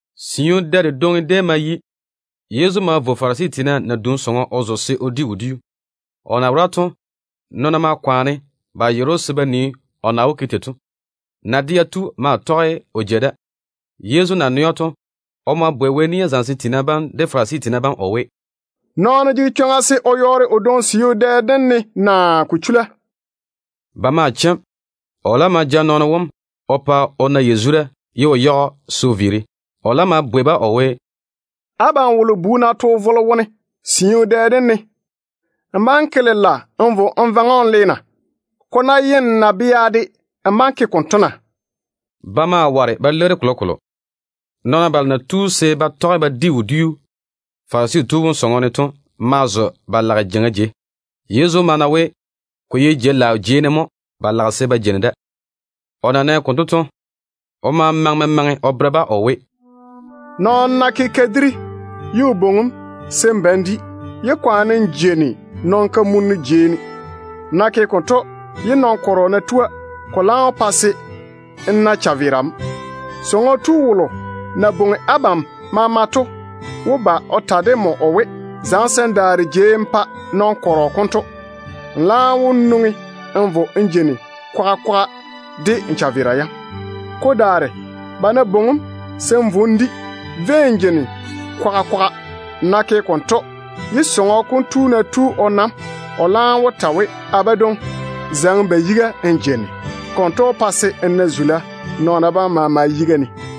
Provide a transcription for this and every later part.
Siu dɛ dedwoŋi déem ma yi. Yezu ma vo Farisi tiina nadum sɔŋɔ o zo se o di wodiu. O na wora to, nɔɔna maa kwaane ba yere‑o se ba nii o na wó ke tei to. Na-dea tu maa tɔge o jei da. Yezu na nɛ‑o to, o ma bwei Wɛ nia zamesem tiina bam de Farisi tiina bam o we, “Nɔɔno jege chwoŋa se o yɔɔre o dwoŋi siu dɛ dem ne naa ko chula?” Ba ma chem. O laam ma ja nɔɔno wom o pa o na yazura ye o yage‑o se o viiri. O laam ma bwei-ba o we, “Abam wolo bu ná to vole wone siu dɛ dem ne, n bá‑n ke lela n vo n vaŋe‑o n le na? Ko ná ye n nabea de, n bá‑n ke konto na?” Ba maa ware ba leiri‑o kolokolo. Nɔɔna balo na tu se ba tɔge ba di wodiu Farisi tu wom sɔŋɔ ne to ma zo ba lage jeiŋa jei. Yezu ma na we ko ye jei-laao jei ne mo ba lage se ba jeini da. O na nɛ konto to, o ma maŋe memaŋe o bere-ba o we: “Nɔɔno ná ke kadiri ye o bwoŋi‑m se n ba n di, yé kwaane n jeini nɔn-kamuna jeiŋa jei ne. Nmo ná ke konto, ye nɔn-yero ná tua, ko laam wó pa se n na n chaveera mo. Sɔŋɔ tu wolo na bwoŋi abam maama to wó ba o ta de nmo o we, ‘Zaŋe se n daare jei n pa nɔn-yero konto.’ Nmo laam wó nwoŋi n vo n jeini kwaga kwaga de n chaveera yam. Ko daare, ba ná bwoŋi‑m se n vo n di, vei n jeini kwaga kwaga. Nmo ná ke konto, ye sɔŋɔ tu wom ná tu o na‑m, o laam wó ta we, ‘A badwoŋi, zaŋe n ba yiga n jeini.’ Konto wó pa se n na zula nɔɔna bam maama yiga ne.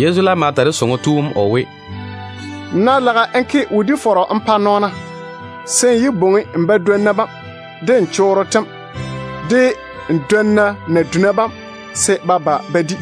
Yezu laam ma ta de sɔŋɔ tu wom o we, “Nmo ná lage n ke wodi-fɔrɔ n pa nɔɔna, se n yé bwoŋi n badwonna bam, de n chorro tem, de n dwonna naduna bam se ba ba ba di.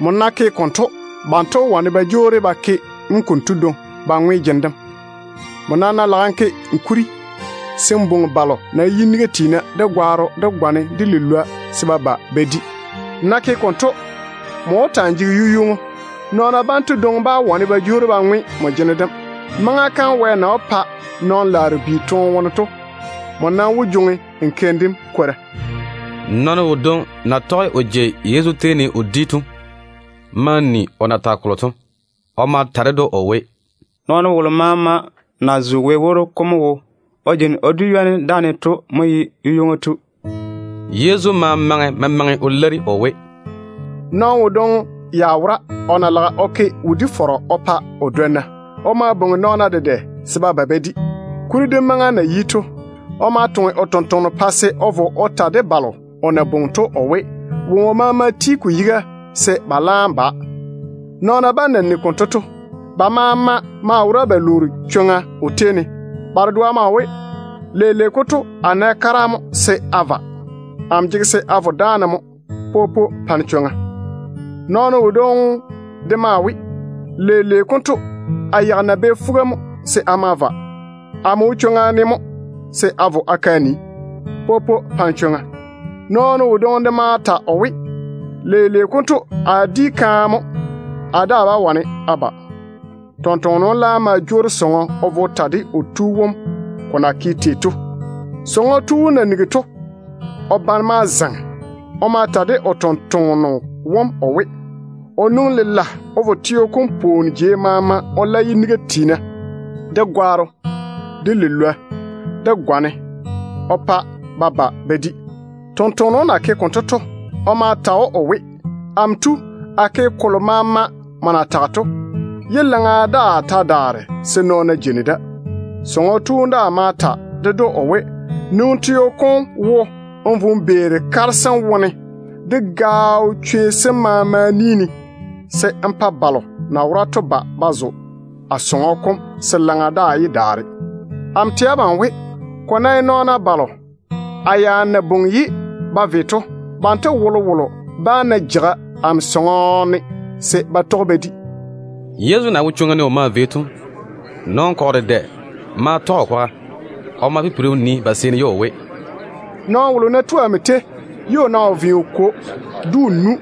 Nmo ná ke konto, banto wó wane ba jwoori ba ke‑m konto dwoŋi ba ŋwe jene dem. Nmo nam ná lage n ke kuri, se n bwoŋi balo na ye yiniga tiina, de gwaaro, de gwane, de lilwoa, se ba ba ba di. Nmo ná ke konto, nmo wó ta‑n jege yu-ywoŋo. Nɔɔna banto dwoŋi bá wane ba jwoori ba ŋwe nmo jene dem. Maŋa kam Wɛ na wó pa nɔn-ŋona bi toone wone to, nmo nam wó jwoŋi n keim dem kwora.” Nɔɔno wodwoŋi na tɔge o jei Yezu tei ne o di to ma ni o na tage kolo to. O ma ta ded‑o o we, “Nɔɔno wolo maama na zo Wɛ woro kom wo o jeini o di ywoni dáane to mo ye yu-ywoŋo tu.” Yezu ma ma memaŋe o leiri o we: “Nɔɔno wodwoŋi ya wora o na lage o ke wodi-fɔrɔ o pa o dwonna. O ma bwoŋi nɔɔna dedɛ se ba ba ba di. Kuri dem maŋa na yi to, o ma toŋe o tontoŋeno se o vo o ta de balo o na bwoŋi to o we, woŋo maama ti ko yiga se ba laam ba. Nɔɔna bam na nigi konto to, ba maama maa wora ba lwoori chwoŋa o tei ne. Ba dedoa maa we, ‘Leile konto a nɛ kara mo se a va. Amo jege se a vo dáane mo. Popo, pa-ne chwoŋa.’ Nɔɔno wodwoŋi de maa we, ‘Leile konto a yeigi nabɛ fuga mo se a ma va. Amo wo chwoŋa ne mo se a vo a ke a nii. Popo, pa-ne chwoŋa.’ Nɔɔno wodwoŋi de ma ta o we, ‘Leile konto a di kaane mo. Amo daa bá wane a ba.’ Tontoŋeno wom laam ma jwoori sɔŋɔ o vo o ta de o tu wom ko na ke tei to. Sɔŋɔ tu wom na nigi to, o bane ma zaŋe. O ma ta de o tontoŋeno wom o we, o nwoŋi lela o vo teo kom pwooni jei maama o la yiniga tiina, de gwaaro, de lilwoa, de gwane o pa ba ba ba di. Tontoŋeno wom na ke konto to, o ma ta o we, ‘Amo tu, a ke kolo maama nmo na tage to, ye laŋa daa ta daare se nɔɔna jeini da.’ Sɔŋɔ tu wom daa ma ta ded‑o o we, ‘Nwoŋi teo kom wo n vo n beeri kare sem wone, de gaao chwei sem maama ni ne, se n pa balo na wora to ba ba zo a sɔŋɔ kom se laŋa daa yé daare. Amo tɛ abam we, ko ná ye nɔɔna balo a ya na bwoŋi ye ba ve to, banto wolowolo bá na jeiga amo sɔŋɔ ne se ba tɔge ba di.’” Yezu na wo chwoŋa ne o maa vei to, nɔn-kɔgɔ dedɛ maa tɔge o kwaga. O ma pipiri o nii ba seeni ye o we, “Nɔɔno wolo ná tu amo tei, ye o ná wo ve o kwo, de o nu,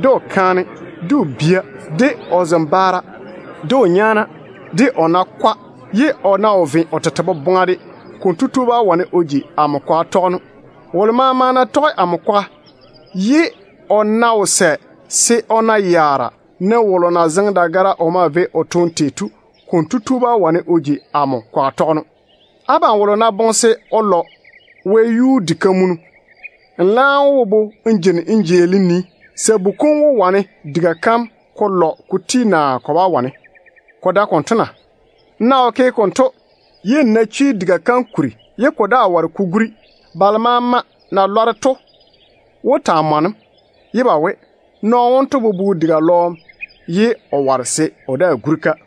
de o kaane, de o bia, de o zembaara, de o nyaana, de o nakwa, ye o ná wo ve o tete boboŋa de, konto tu bá wane o ji amo kwaga tɔgeno. Wolo maama ná tɔge amo kwaga ye o ná wo sɛ se o na yaara, ne wolo na zeŋe dagara o maa vei o toone tei to, konto tu bá wane o ji amo kwaga tɔgeno. Abam wolo ná boŋe se o lɔ wɛyuu di-dedɔrɔ, nmo laam wó bobo n jeini n jeeli n nii, sabu kom wó wane diga kam ko lɔ ko ti naa ko bá wane. Ko dae konto na? N ná wo ke konto, ye n ná chwi diga kam kuri ye ka lɔɔm daa ware ko guri, balo maama na lɔre to wó taa mɔne‑m, ye ba we, ‘Nɔɔno wonto bobo diga lɔɔm ye o ware o guri-ka.’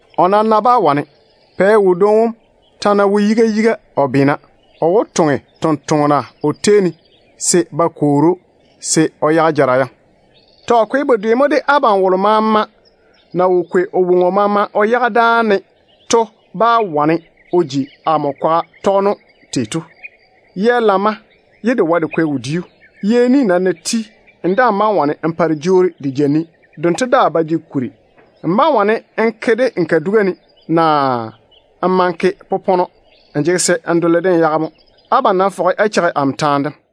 O nam ná bá wane, pɛ wodwoŋi wom ta ná wo yiga yiga o beena, o wó toŋe tontoŋena o tei ne se ba kwoori‑o se o yage jara yam. Tɔ. Ko ye bedwe mo de abam wolo maama ná wo kwei o woŋo maama o yage dáa ne, kotu bá wane o ji amo kwaga tɔgeno. Yɛ lamma ye de wae de kwɛ wodiu. Yɛ ni nam ná ti, n daa‑n bá‑n wane n pa de jwoori de ja ni. Dento daa ba jege kuri. N bá‑n wane n ke-de n kaduga ne, naa n ma n ke popɔnɔ. Nmo jege se n lwo-de n yage mo. Abam nam fɔge á cheigi amo taane dem.”